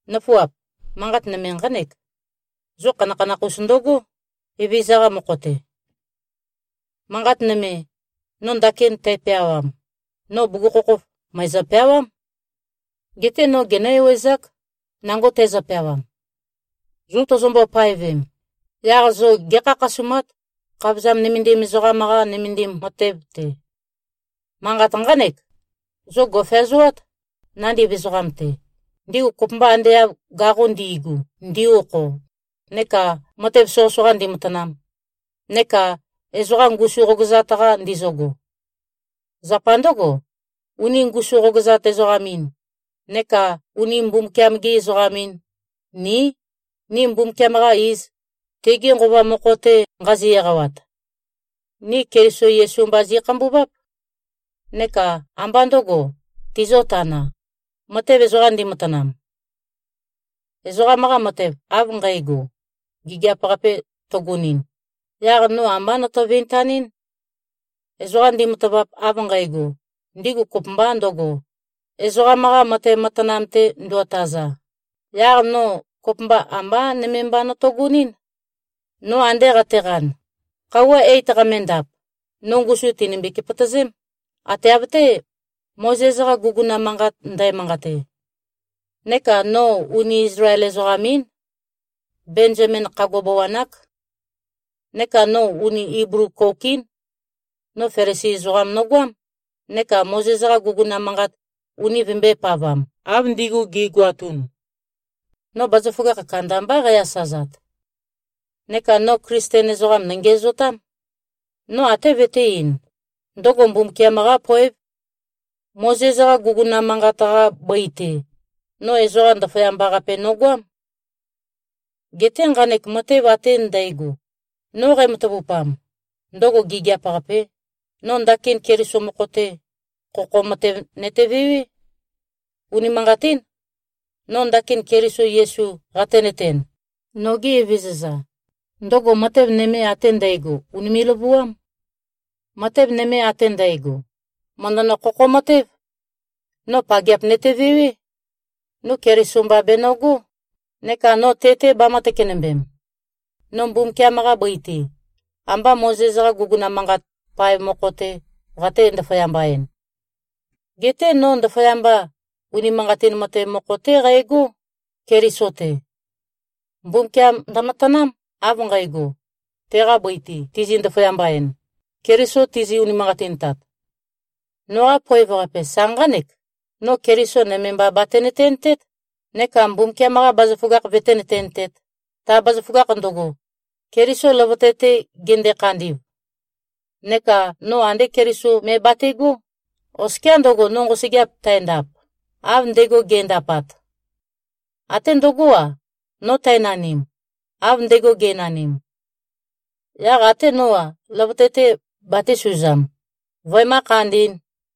Nǿfuap! Manqat nøme nqánek: Zo khanakhanakh-us ndøgó, Evezøza-qa mokho-te. Manqat nøme, no ndakin tæpeawam, no bugukhokhof mø̀ezø-peawám. Geté no genǿ-ewezák, nango tæzø-peawam. Zo tozombo-paevem, yaq zo gé꞉khakhasumát, khavozam nømendim ezoqam-qa nømendim matev-te. Manqat nqánek: Zo gò꞉feazoát, nandiv ezoqam-te, ndigu kopømba ande av gaqo ndi꞉gu ndi-okho, neka matev soqøsoqa ndimatanam, neka ezoqa ngusu qogøzat-qa ndizøgo. Zapa ndǿgo, uni ngusu-qogøzat-ezoqam-in neka uni Mbumbukiam-gi-ezoqam-in, ní, ni Mbumbukiam-qa iz, tege Nqova mokho-te nqazi-eqawat. Ni Keliso Yesu mba zi꞉khambuváp. Neka ambá ndø̄go tizio-tanā, matev ezoqa ndimatanam. Ezoqam-qa matev av nqægo, gigiap-qape tøgonɨn, yaq no ambá noto-vintanɨ́n. Ezoqa ndimatavap av nqægo, ndigu kopømba ndøgo, ezoqam-qa matev matanam-te nduotaza, yaq no kopømba ambá nøme mba notogonɨ́n. No ande qateqan, khøuwa eit qamendap, no ngusum tìnømbi-kepøtøzém, ate av-té, Mozes-qa guguna manqat ndæmanqate. Neka no uni Izlael-ezoqam-ín. Benzamin khagua bawan-ák. Neka no uni Iblu-kouk-ín. No Felisi ezoqam nogoám, neka Mozes-qa guguna manqat uni vøembøē-pavam, av ndigu gi꞉goatun. No bazaføgakh kandambá qæ-asazat. Neka no Klisten ezoqam nøngiæzotám. No até vøtē-ein, ndøgo Mbumbukiam-qá poév. Mozes-qa guguna manqat-qa bøi-te, no ezoqa ndaføyamba-qape nogoám. Geté nqanek matev ate ndægo, no qæmatavupam, ndøgo gigiap-qapē, no ndakin Keliso mokho-te, khokho matev nøtevewé. Unimanqatín. No ndakin Keliso Yesu qatenøten, noge Evezøza, ndøgo matev nøme ate ndægo, ùnime꞉-løvuám. Matev nøme ate ndægo, mø̀ndønø-khokho-matév. No pageap nøtevewé. No Keliso mba benøgó, neka no te-te bamø̄-tøkenømbem. No Mbumbukiam-qa bøi-te, ambá Mozes-qa guguna manqat paev mokho-tē qate-ndaføyamba-ēn. Geté no ndaføyamba, unimanqatin matev mokho-té qægó, Keliso-te. Mbumbukiam ndømatanám, av nqægo, teqa bøi-te tizi-ndaføyamba-en, Keliso tizi-unimanqatintat. Noqa poev-qape sa nqánek: No Keliso nøme mba batenøtentét, neka Mbumbukiam-qa bazaføgakh vøténøtentēt, ta bazaføgakh ndøgo, Keliso løvøte-te gende-khandi꞉v. Neka no andé Keliso me bate꞉gó, oskiá ndøgo, no nqosøgeap tændap, av ndego ge꞉ndapat. Até ndøgó-a, no tænanim, av ndego ge꞉nanim. Yaq até nó-a, løvøte-te batēsuzam, vøemǿ-khandī꞉n.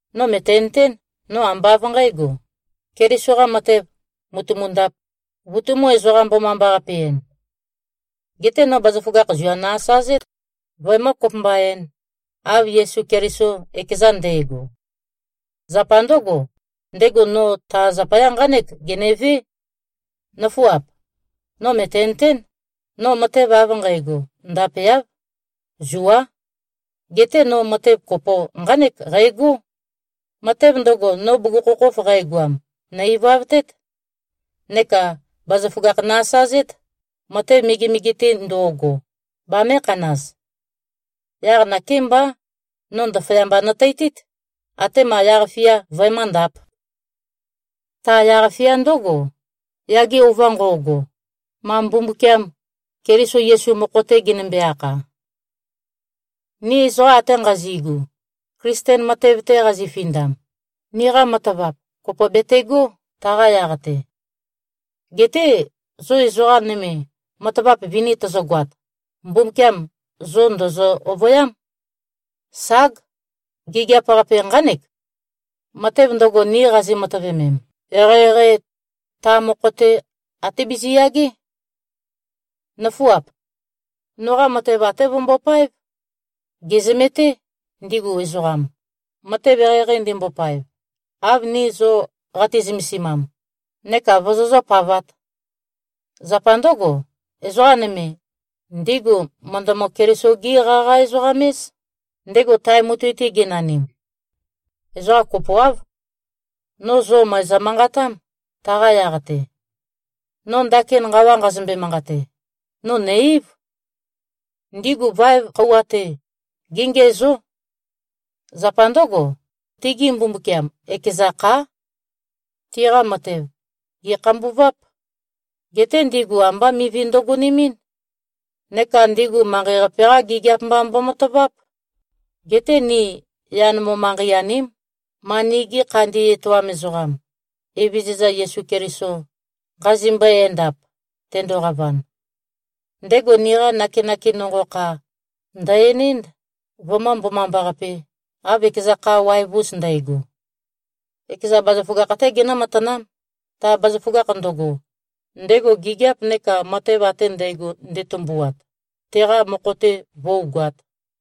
No mø̀tenøtén, no ambá av nqǣgo, Keliso-qa matev mùtumundāp, vutumū-ezoqa-mbomambaqape-en. Geté no bazaføgakh zua nø-asazét, vøemǿ-kopømba-ēn, av Yesu Keliso ekeza nde꞉go. Zapa ndǿgo, ndego no ta zapaya nqánek genevé. Nøfuap! No mø̀tenøtén, no matev av nqægo ndapeáv. Zuá. Geté no matev kopo nqánek qægó: Matev ndøgo, no bugukhokhof qægoam, nø̀-ivavtét. Neka bazaføgakh nø-asazét, matev megemege-te ndo꞉go, bamēkhanaz. Yaq nakémbá, no ndaføyamba nøteitít, atema yaq-fia vøemǿndāp. Ta yaq-fia ndǿgo, yage ova nqo꞉go, ma Mbumbukiam Keliso Yesu mokho-te genømbe-akha. Ni ezoqa ate nqazi꞉gu, Klisten matev-te qazifindam, niqa matavap kopo betegó, taqa yaq-te. Geté zo ezoqa nøme, matavap vini tøzøgoat, Mbumbukiam zo ndø̀zø-ovøyám. Ság! Gigiap-qape nqánek. Matev ndøgo, ni qazi-matøvemem, eqeieqeī, ta mokho-te até biziyagé. Nǿfuap. Noqa matev até vømbopáev. Gèzømeté, ndigu ezoqam, matev eqeieqei ndimbopaev, av ni zo qati-zømesimam, neka vozozǿ-pavāt. Zapa ndǿgo, ezoqa nøme, ndigu mø̀ndømø-Keliso-gí-qaqa-ezoqam-éz, ndego tae mutui-te genanim. Ezoqa kopoáv. No zo mø̀ezø-manqatám, taqa yaq-te. No ndakin nqawa nqazømbe-manqate, no nø̀-eív. Ndigu vaev khøuwa-te, géngiæzó. Zapa ndǿgo, tigi mbumbukiam, ekeza khá. Tiqa matev, gè꞉khambuváp. Geté ndigu ambá mivi ndøgonemɨ́n. Neka ndigu manqei-qape-qa gigiap mba mbomataváp. Geté ni yan mo-manqei-aním, ma nigi khandi etoam ezoqam, Evezøza Yesu Keliso, nqazimbøe-endap, tendoqavan. Ndego niqa nakenake nonqo kha, ndø̀-enénd, vømǿ-mbomambaqapē, av ekeza kha waev-us ndægo. Ekeza bazaføgakh-té genǿ-matanám, ta bazaføgakh ndøgo, ndego gigiap neka matev ate ndægo nde꞉tømbuat, teqa mokho-te vǿugoāt.